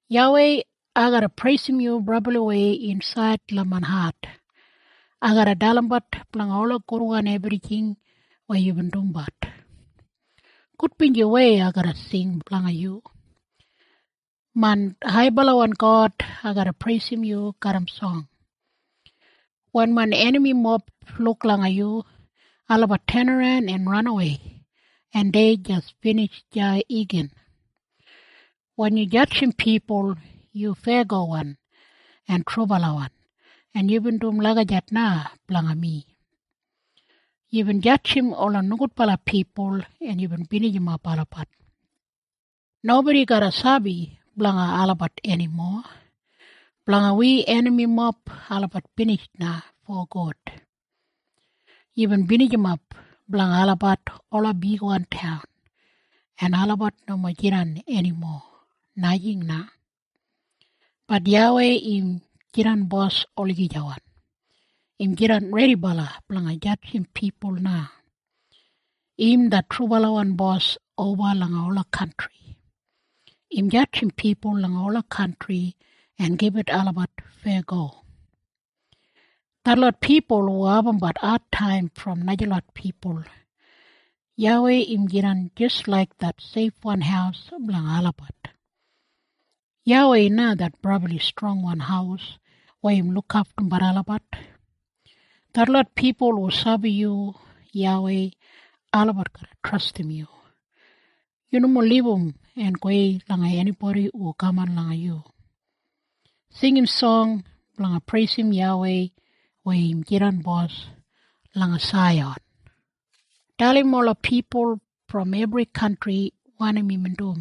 YAWEI, ai garra preisim yu brabliwei insaid langa main hat. Ai garra dalimbat blanga ola gudwan ebrijing weya yubin dumbat. Gudbinjiwei ai garra sing blanga yu. Main haibalawan God, ai garra preisim yu garram song. Wen main enamimob luk langa yu, olabat tenaran en ranawei, en dei jis binij deya igin. Wen yu jadjim pipul yu feyagowan en trubalawan en yubin dum lagijat na blanga mi. Yubin jadjim ola nogudbala pipul en yubin binijimap olabat. Nobodi garra sabi blanga olabat enimo. Blanga wi enamimob olabat binij na fogud. Yubin binijimap blanga olabat ola bigwan taun, en olabat nomo jidan enimo, najing na. Bat YAWEI im jidan bos olagijawan. Im jidan redibala blanga jadjim pipul na. Im det trubalawan bos oba langa ola kantri. Im jadjim pipul langa ola kantri en gibit olabat feyago. Detlot pipul hu abumbat adtaim brom najalot pipul, YAWEI im jidan jis laik det seifwan haus blanga olabat. YAWEI na det brabli strongwan haus weya im lukaftum olabat. Detlot pipul hu sabi yu YAWEI, olabat garra trastim yu. Yu nomo libum en gowei langa enibodi hu kaman langa yu. Singim song blanga preisim YAWEI weya im jidan bos langa Saiyan. Dalim ola pipul brom ebri kantri wanim imbin dum.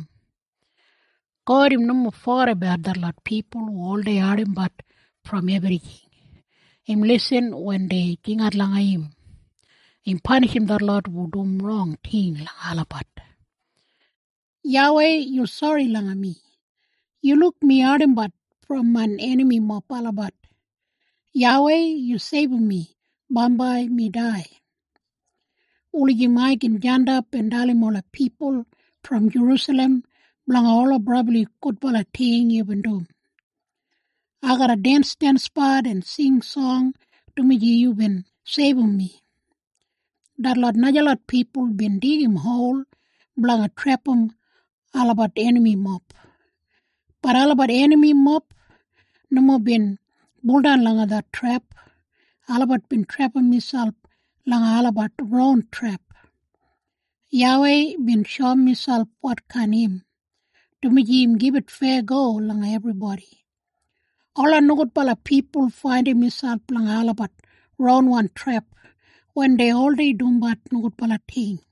God im nomo fogedabat detlot pipul hu oldei ardimbat brom ebrijing. Im lisin wen dei jingat langa im. Im panishim detlot hu dum rong ting langa olabat. YAWEI, yu sori langa mi. Yu luk mi ardimbat brom main enamimob olabat. YAWEI yu seibum mi, bambai mi dai, wulijim ai gin jandap en dalim ola pipul brom Jerusalem blanga ola brabli gudbala ting yubin dum. Ai garra densdensbat en sing song dumaji yubin seibum mi. Detlot najalot pipul bin digim hol blanga trepam olabat enamimob, bat olabat enamimob nomo bin buldan langa det trep. Olabat bin trepam miselp langa olabat ron trep. YAWEI bin shoum miselp wotkain im, dumaji im gibit feyago langa ebribodi. Ola nogudbala pipul faindim miselp langa olabat ronwan trep, wen dei oldei dumbat nogudbala ting.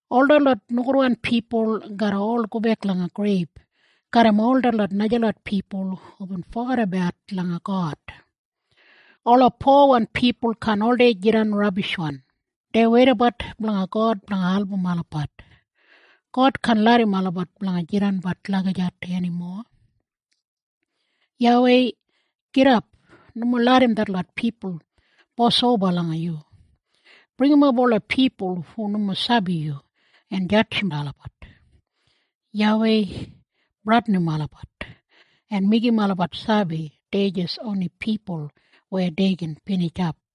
Ol detlot nogudwan pipul garra ol gobek langa greib garram ol detlot najalot pipul hubin fogedabat langa God. Ola powan pipul kaan oldei jidan rabishwan. Dei weidabat blanga God blanga album olabat. God kaan larram olabat blanga jidanbat lagijat enimo. YAWEI, gidap! Nomo larram detlot pipul bosoba langa yu! Bringimap ola pipul hu nomo sabi yu, en jadjim olabat! YAWEI, bradinim olabat, en meigim olabat sabi dei jis oni pipul weya dei gin binijap.